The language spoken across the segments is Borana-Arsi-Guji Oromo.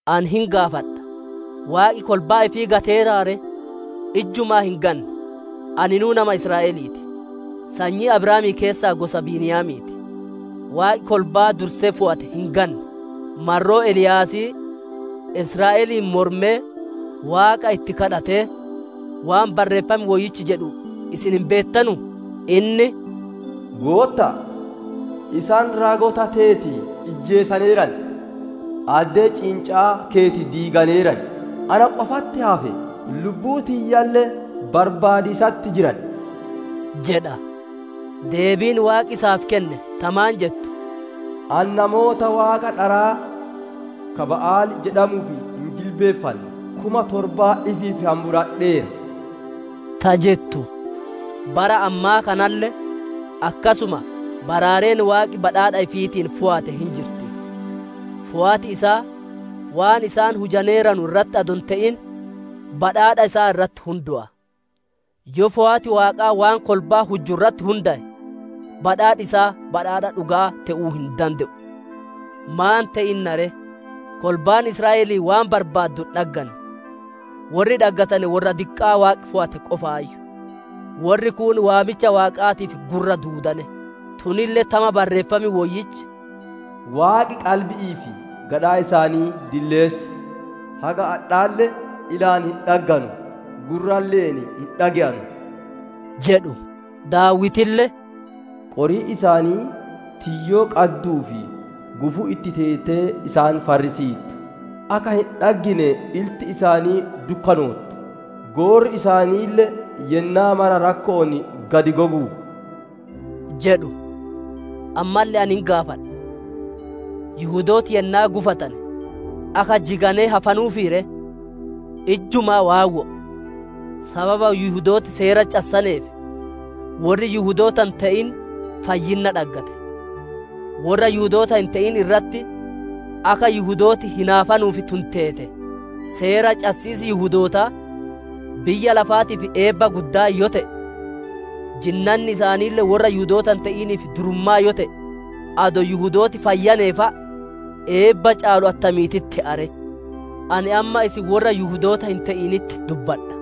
Ani hin gaafadha: Waaqi kolbaa ifii gateeraa ree? Ijjumaa hin ganne! Aninuu nama Israa'elii ti; sanyii Abrahaamii keessaa gosa Beniyaamii ti. Waaqi kolbaa dursee fooyate hin ganne. Marroo Eliyaasii, ka Israa'eliin mormee Waaqa itti daadimatee, waan Barreeffam Woyyichi jedhu, isin hin beettanuu? Inni, «Gootta'a! Isaan raagota teeti ijjeesaneeran, addee ciinca'aa keeti diiganeeran; na qofatti hafe; lubbuu tiyyalle barbaadiisatti jiran» jedha. Deebiin Waaqi isaaf kenne ta maan jettu? «Ani namoota waaqa dharaa ka Ba'aali jedhamuuf hin jilbiiffanne kuma torba ifiif hamburadheera» ta jettu. Bara ammaa kanalle akkasuma baraareen Waaqi badhaadha ifiitiin fooyate hin jirti. Fooyati isaa waan isaan hujaneeranu irratti adoo hin te'in, badhaadha isaa irratti hundaya. Yoo fooyati Waaqaa waan kolbaan hujju irratti hundaye, badhaadhi isaa badhaadha dhuga'aa te'uu hin dande'u. Maan te'inna ree? Kolbaan Israa'elii waan barbaaddu hin dhagganne. Worri dhaggatane worra diqqaa Waaqi fooyate qofaayyu; worri kuun waamicha Waaqaatiif gurra duudane. Tunille tama Barreeffam Woyyichi, «Waaqi qalbi'ii fi gadhaa isaanii dilleesse; haga adhaalle ilaan hin dhagganu; gurralle'een hin dhage'anu» jedhu. Daawitille, «Qoriin isaanii tiyyoo qadduu fi gufuu itti teetee isaan farrisiittu. Akka hin dhaggine ilti isaanii dukkanoottu; goorri isaaniille yennaa mara rakko'oon gad gogu» jedhu. Ammalle ani hin gaafadha: Yihudooti yennaa gufatane, akka jiganee hafanuuf ree? Ijjumaa waawwo'o; sababa Yihudooti Seera cassaneef worri Yihudoota hin te'in fayyinna dhaggate; worra Yihudoota hin te'in irratti akka Yihudooti hinaafanuuf tun teete. Seera cassiisi Yihudootaa biyya lafaatiif eebba guddaa yoo te'e, jinnanni isaaniille worra Yihudoota hin te'iniif durummaa yoo te'e, adoo Yihudooti fayyanee fa'a eebba caalu attamiititti te'a ree! Ani amma isin worra Yihudoota hin te'initti dubbadha: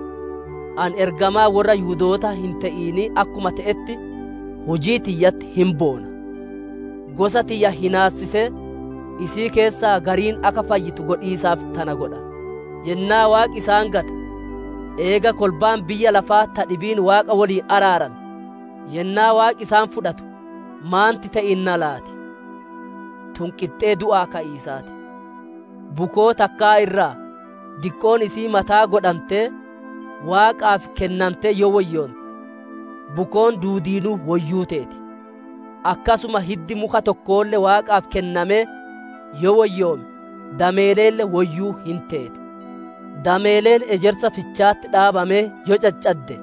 ani ergamaa worra Yihudoota hin te'inii akkuma te'etti, hujii tiyyatti hin boona. Gosa tiyya hinaassisee, isii keessaa gariin akka fayyitu godhiisaaf tana godha. Yennaa Waaqi isaan gate, eega kolbaan biyya lafaa ta dhibiin Waaqa woliin araarante, yennaa Waaqi isaan fudhatu maanti te'inna laati? Tun qixxee du'aa ka'iisaa ti! Bukoo takkaa irraa diqqoon isi'ii mataa godhantee, Waaqaaf kennante yoo woyyoonte, bukoon duudiinuu woyyuu teeti; akkasuma hiddi muka tokkoolle Waaqaaf kennamee yoo woyyoome, dameeleelle woyyuu hin teeti. Dameeleen ejersa ficha'atti dhaabamee yoo caccadde,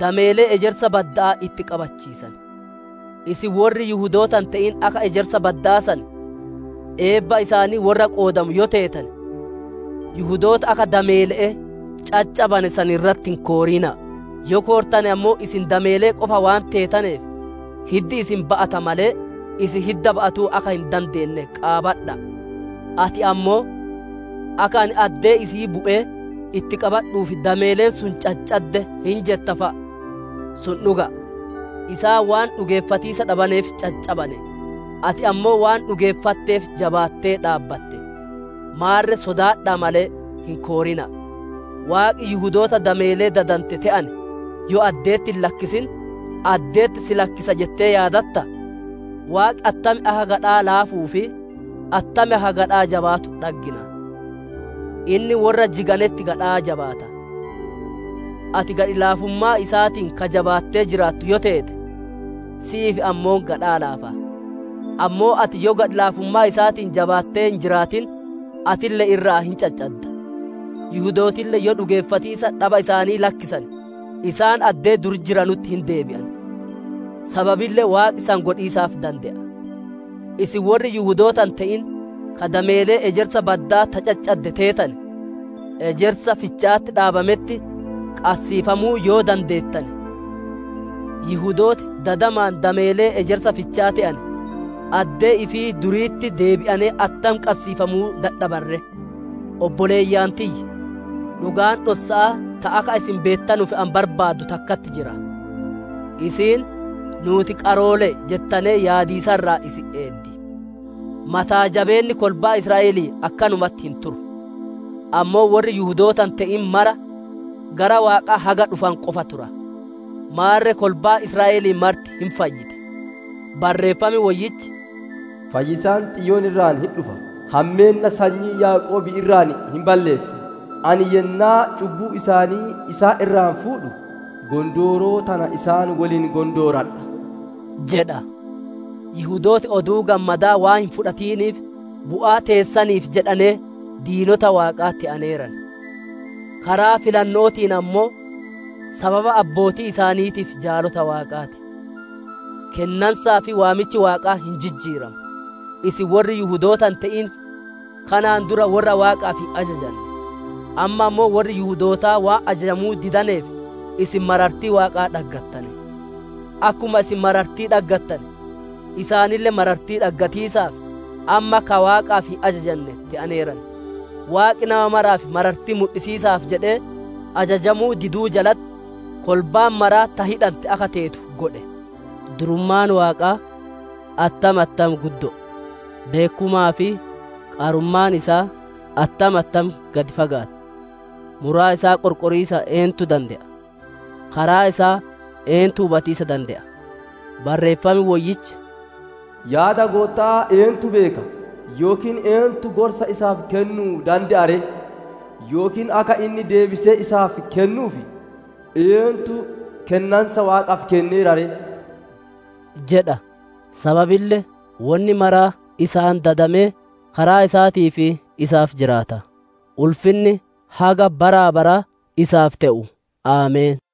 dameelee ejersa badda'aa itti qabachiisan. Isin worri Yihudoota hin te'in akka ejersa bada'aa san, eebba isaanii worra qoodamu yoo teetane, Yihudoota akka dameele'ee caccabane san irratti hin koorina'a. Yoo koortane ammoo isin dameelee qofa waan teetaneef, hiddi isin ba'ata malee, isin hidda ba'atuu akka hin dandeenne qaabadha'a. Ati ammoo, «Akka ani addee isi'ii bu'ee itti qabadhuuf dameeleen sun caccadde» hin jetta fa'a. Sun dhuga'a. Isaan waan dhugeeffatiisa dhabaneef caccabane, ati ammoo waan dhugeeffatteef jabaattee dhaabbatte. Maarre sodaadha'a malee, hin koorina'a. Waaqi Yihudoota dameelee dadante te'ane yoo adde'etti hin lakkisin, adde'etti si lakkisa jettee yaadattaa? Asitti Waaqi attam akka gadhaa laafuu fi attam akka gadhaa jabaatu dhaggina. Inni worra jiganetti gadhaa jabaata, ati gadhi laafummaa isaatiin ka jabaattee jiraattu yoo teete si'iif ammoo gadhaa laafa. Ammoo ati yoo gadhi laafummaa isaatiin jabaattee hin jiraatin, atille irraa hin caccadda. Yihudootille yoo dhugeeffatiisa dhaba isaanii lakkisane, isaan addee dur jiranutti hin deebi'an; sababille Waaqi san godhiisaaf dande'a. Isin worri Yihudoota hin te'in, ka dameelee ejersa badda'aa ta caccadde teetane, ejersaa ficha'atti dhabametti qassiifamuu yoo dandeettane, Yihudooti dadamaan dameelee ejersa ficha'a te'ane, addee ifii duriititti deebi'ane attam qassiifamuu dadhaban ree! Obboleeyyan tiyya! Dhugaan dhossa'aa ta akka isin beettanuuf ani barbaadu takkatti jira; isiin, nuuti qaroole'e jettanee yaadiisa irraa isin eeddi. Mataa jabeenni kolbaa Israa'elii akkanumatti hin turu; ammoo worri Yihudoota hin te'in mara gara Waaqaa haga dhufanu qofa tura. Maarre kolbaan Israa'elii marti hin fayyiti. Barreeffam Woyyichi, «Fayyisaan Xiyoon irraa hin dhufa, hammeenna sanyii Yaaqoobii irraa hin balleessa. Ani yennaa cubbuu isaanii isaan irraa fuudhu, gondooroo tana isaan woliin gondooradha» jedha. Yihudooti Oduu Gammadaa waan hin fudhatiniif, bu'aa teessaniif jedhanee diinota Waaqaa te'aneeran. Karaa filanno'ootiin ammoo, sababa abbootii isaaniitiif jaalota Waaqaa ti. Kennansaa fi waamichi Waaqaa hin jijjiiramu. Isin worri Yihudoota hin te'in kanaan dura worra Waaqaaf hin ajajanne; amma ammoo worri Yihudootaa waan ajajamuu didaneef isin marartii Waaqaa dhaggattane. Akkuma isin marartii dhaggattane, isaaniille marartii dhaggatiisaaf, amma ka Waaqaaf hin ajajanne te'aneeran. Waaqi nama maraaf marartii mudhisiisaaf jedhee, ajajamuu diduu jalatti kolbaan mara ta hidhante akka teetu godhe. Durummaan Waaqaa attam attam guddo'o! Beekkumaa fi qarummaan isaa attam attam gad fagaatti! Muraa isaa qorqoriisa eentu dande'a? Karaa isaa eentu hubatiisa dande'a? Barreeffam Woyyichi, «Yaada Gootta'aa eentu beeka? Yookiin eentu gorsa isaaf kennu'uu dande'a ree? Yookiin akka inni deebisee isaaf kennuuf, eentu kennansa Waaqaaf kenneera ree?» jedha. Sababille wonni maraa isaan dadamee, karaa isaatii fi isaaf jiraata. Ulfinni haga bara baraa isaaf te'u! Ameen!